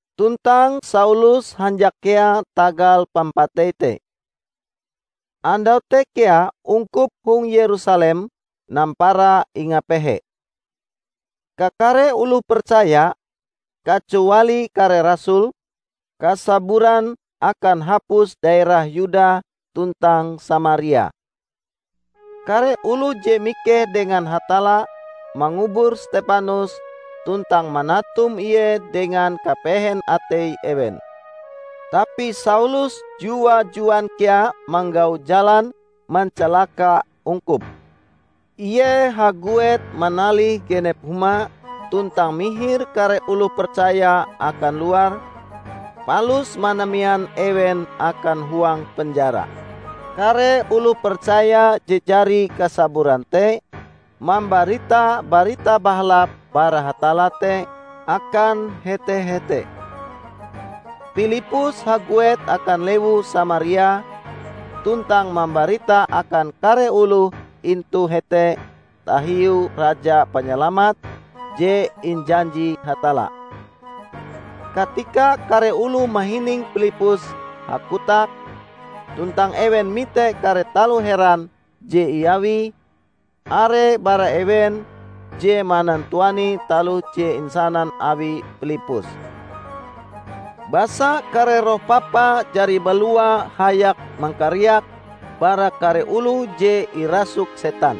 Tuntang Saulus hanjak kea tagal pampatei te. Andau te kea ungkup hong Yerusalem nampara ingapehe. Kakare oloh percaya, kacuali kare rasul, kasaburan akan hapus daerah Yuda tuntang Samaria. Kare oloh je mikeh dengan Hatalla mangubur Stepanus tuntang manatum ie dengan kapehen atei ewen. Tapi Saulus jua-juan kea manggau jalan mancalaka ungkup. Ie haguet manalih genep huma tuntang mihir kare oloh percaya akan luar, palus manamean ewen akan huang penjara. Kare oloh percaya je jari kasaburan te mambarita Barita Bahalap bara Hatalla te akan hete-hete. Pilippus haguet akan lewu Samaria tuntang mambarita akan kare oloh intu hete tahiu Raja Panyalamat je injanji Hatalla. Katika kare oloh mahining Pilippus hakotak tuntang ewen mite kare taloh heran je iawie, are bara ewen je manantuani taloh je insanan awi Pilippus. Basa kare roh papa jari balua hayak mangkariak bara kare oloh je irasuk setan.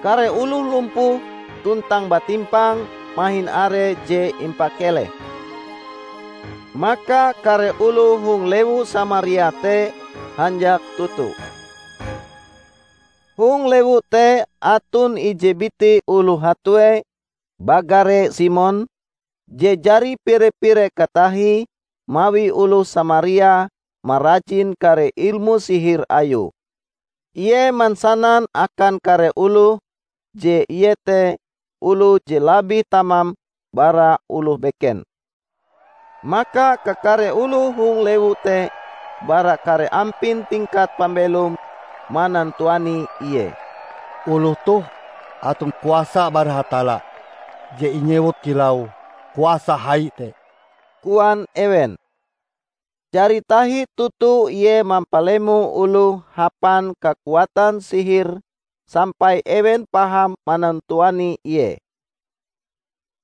Kare oloh lumpuh tuntang batimpang mahin are je impakeleh. Maka kare oloh hong lewu Samaria te hanjak toto. Hong lewu te aton ije biti oloh hatue bagare Simon, je jari pire-pire katahie mawi oloh Samaria marajin kare ilmu sihir ayue. Ie mansanan akan kare oloh je ie te oloh je labih tamam bara oloh beken. Maka kakare oloh hong lewu te bara kare ampin tingkat pambelome manantuani ie. "Oloh toh aton kuasa bara Hatalla je inyewut kilau 'Kuasa hai' te," koan ewen. Jari tahi toto ie mampalemo oloh hapan kakuatan sihire sampai ewen paham manantuani ie.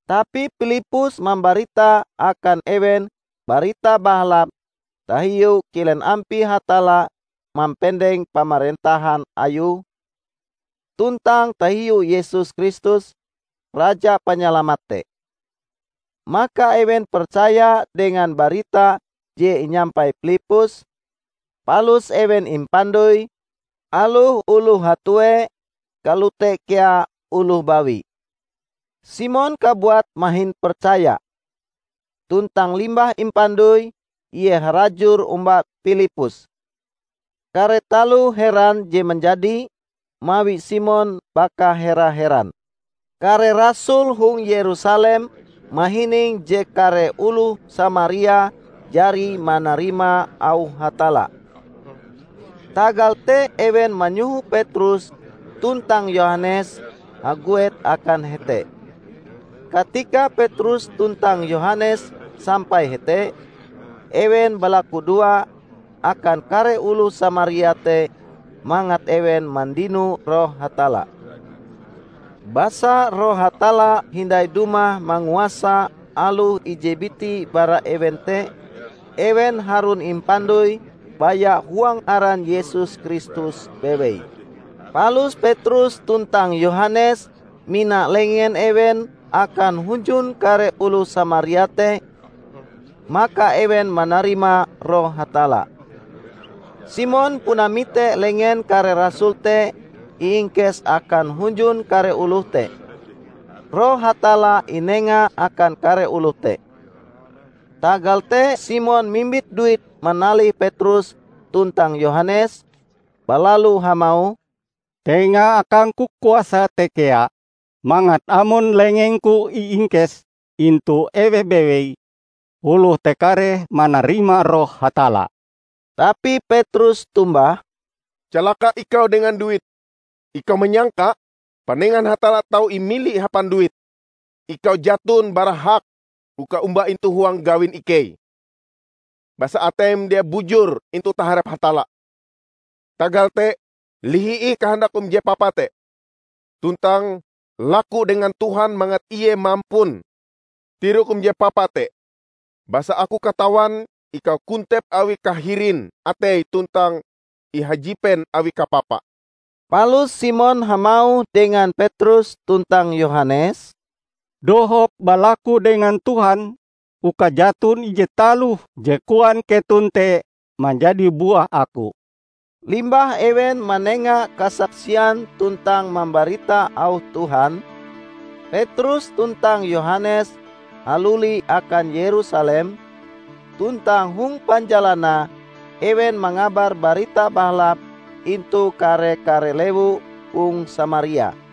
Tapi Pilippus mambarita akan ewen Barita Bahalap tahiu kilen ampie Hatalla mampendeng pamarentahan Ayue, tuntang tahiu Yesus Kristus, Raja Panyalamat te. Maka ewen percaya dengan barita je inyampai Pilippus, palus ewen impandoi -- aloh oloh hatue, kalote kea oloh bawi. Simon kabuat mahin percaya. Tuntang limbah impandoi, ie harajur omba Pilippus. Kare taloh heran je manjadi, mawi Simon baka hera-heran. Kare rasul hong Yerusalem mahining je kare oloh Samaria jari manarima auh Hatalla. Tagal te ewen manyoho Petrus tuntang Yohanes haguet akan hete. Katika Petrus tuntang Yohanes sampai hete, ewen balakudoa akan kare oloh Samaria te mangat ewen mandino Roh Hatalla. Basa Roh Hatalla hindai dumah manguasa aloh ije biti bara ewen te; ewen harun impandoi baya huang aran Yesus Kristus bewei. Palus Petrus tuntang Yohanes mina lengen ewen akan hunjun kare oloh Samaria te; maka ewen manarima Roh Hatalla. Simon puna mite lengen kare rasul te iingkes akan hunjun kare oloh te, Roh Hatalla inenga akan kare oloh te. Tagal te Simon mimbit duit manalih Petrus tuntang Yohanes, balalu hamauh, "Tenga akangku kuasa te kea mangat amon lengengku iingkes intu eweh bewei, oloh te kareh manarima Roh Hatalla." Tapi Petrus tombah, "Calaka ikau dengan duitm! Ikau manyangka panengan Hatalla tau imili hapan duit? Ikau jaton bara hak uka omba intu huang gawin ikei, basa ateim dia bujur intu taharep Hatalla. Tagal te lihi ih kahandakm je papa te, tuntang laku dengan Tuhan mangat Ie mampun tirokm je papa te. Basa aku katawan ikau kontep awi kahirin atei tuntang ihajipen awi kapapa." Palus Simon hamauh dengan Petrus tuntang Yohanes, "Dohop balaku dengan Tuhan uka jaton ije taloh je koan keton te manjadi buah aku." Limbah ewen manenga kasaksian tuntang mambarita auh Tuhan, Petrus tuntang Yohanes haluli akan Yerusalem, tuntang hong panjalanae ewen mangabar Barita Bahalap intu kare-kare lewu hong Samaria.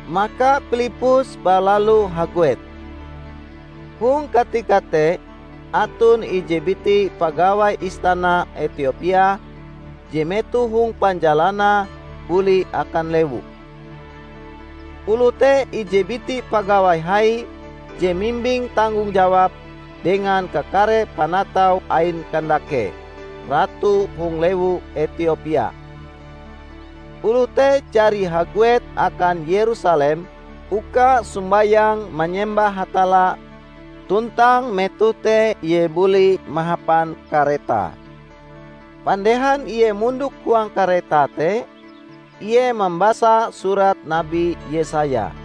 Maka Pilippus balalu haguet. Hong katika te aton ije biti pagawai istana Etiopia je metoh hong panjalanae buli akan lewue. Oloh te ije biti pagawai hai je mimbing tanggong jawab dengan kakare panatau ain Kandake, Ratu hong lewu Etiopia. Oloh te jari haguet akan Yerusalem uka sombayang manyembah Hatalla tuntang metoh te ie buli mahapan karetae. Pandehan ie mondok huang karetae te, ie mambasa Surat Nabi Yesaya.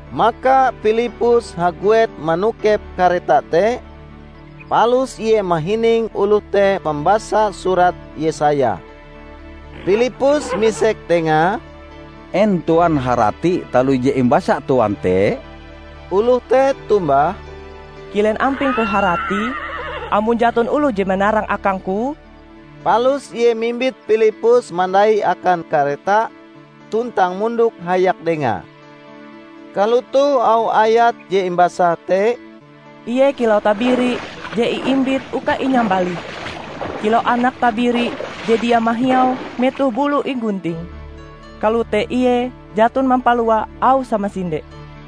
Maka Pilippus haguet manokep kareta te, palus ie mahining oloh te mambasa Surat Yesaya. Pilippus misek dengae, "En Tuan harati taloh je imbasa Tuan te?" Oloh te tombah, "Kilen ampingku haratie, amon jaton oloh je manarang akangku?" Palus ie mimbit Pilippus mandai akan kareta tuntang mondok hayak dengae. Kalotoh auh ayat je imbasae te, "Ie kilau tabiri je iimbit uka inyambalih, kilau anak tabiri je dia mahiau metoh bulue inggunting, kalote ie jaton mampalua auh samasinde.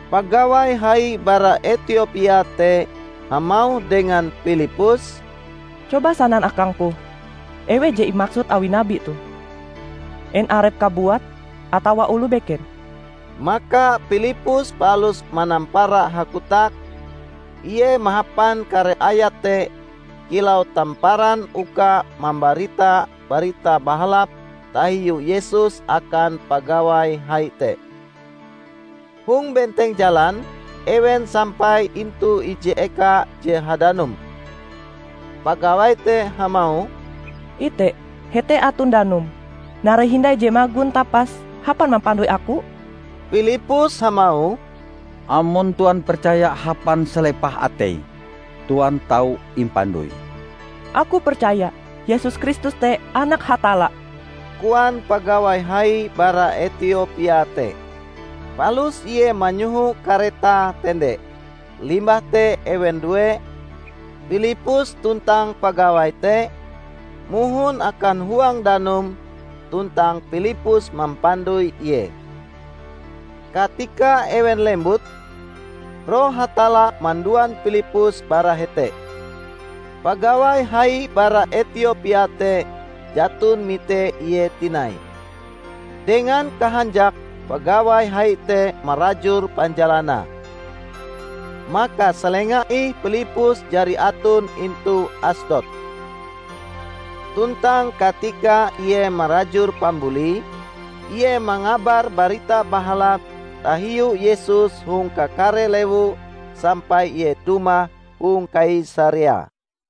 Pagawai hai bara Etiopia te hamauh dengan Pilippus, "Coba sanan akangku, eweh je imaksud awi nabi toh? En arepe kabuat atawa oloh beken?" Maka Pilippus palus manampara hakotak; ie mahapan kare ayat te kilau tamparan uka mambarita Barita Bahalap tahiu Yesus akan pagawai hai te. Hong benteng jalan, ewen sampai intu ije eka je hadanum. Pagawai te hamauh, "Ite hete aton danum! Narai hindai je magon tapas hapan mampandoi aku?" [ Pilippus hamauh, "Amon Tuan percaya hapan salepah atei, Tuan tau impandoi." "Aku percaya Yesus Kristus te Anak Hatalla," koan pagawai hai bara Etiopia te.] Palus ie manyoho karetae tende; limbah te ewen due, Pilippus tuntang pagawai te, mohon akan huang danum tuntang Pilippus mampandoi ie. Katika ewen lembut, Roh Hatalla manduan Pilippus bara hete. Pagawai hai bara Etiopia te jaton mite ie tinai. Dengan kahanjake pagawai hai te marajur panjalanae. Maka salenga ih Pilippus jari aton intu Asdod. Tuntang katika ie marajur pambulie, ie mangabar Barita Bahalap tahiu Yesus hong kakare lewu sampai ie dumah hong Kaisarea.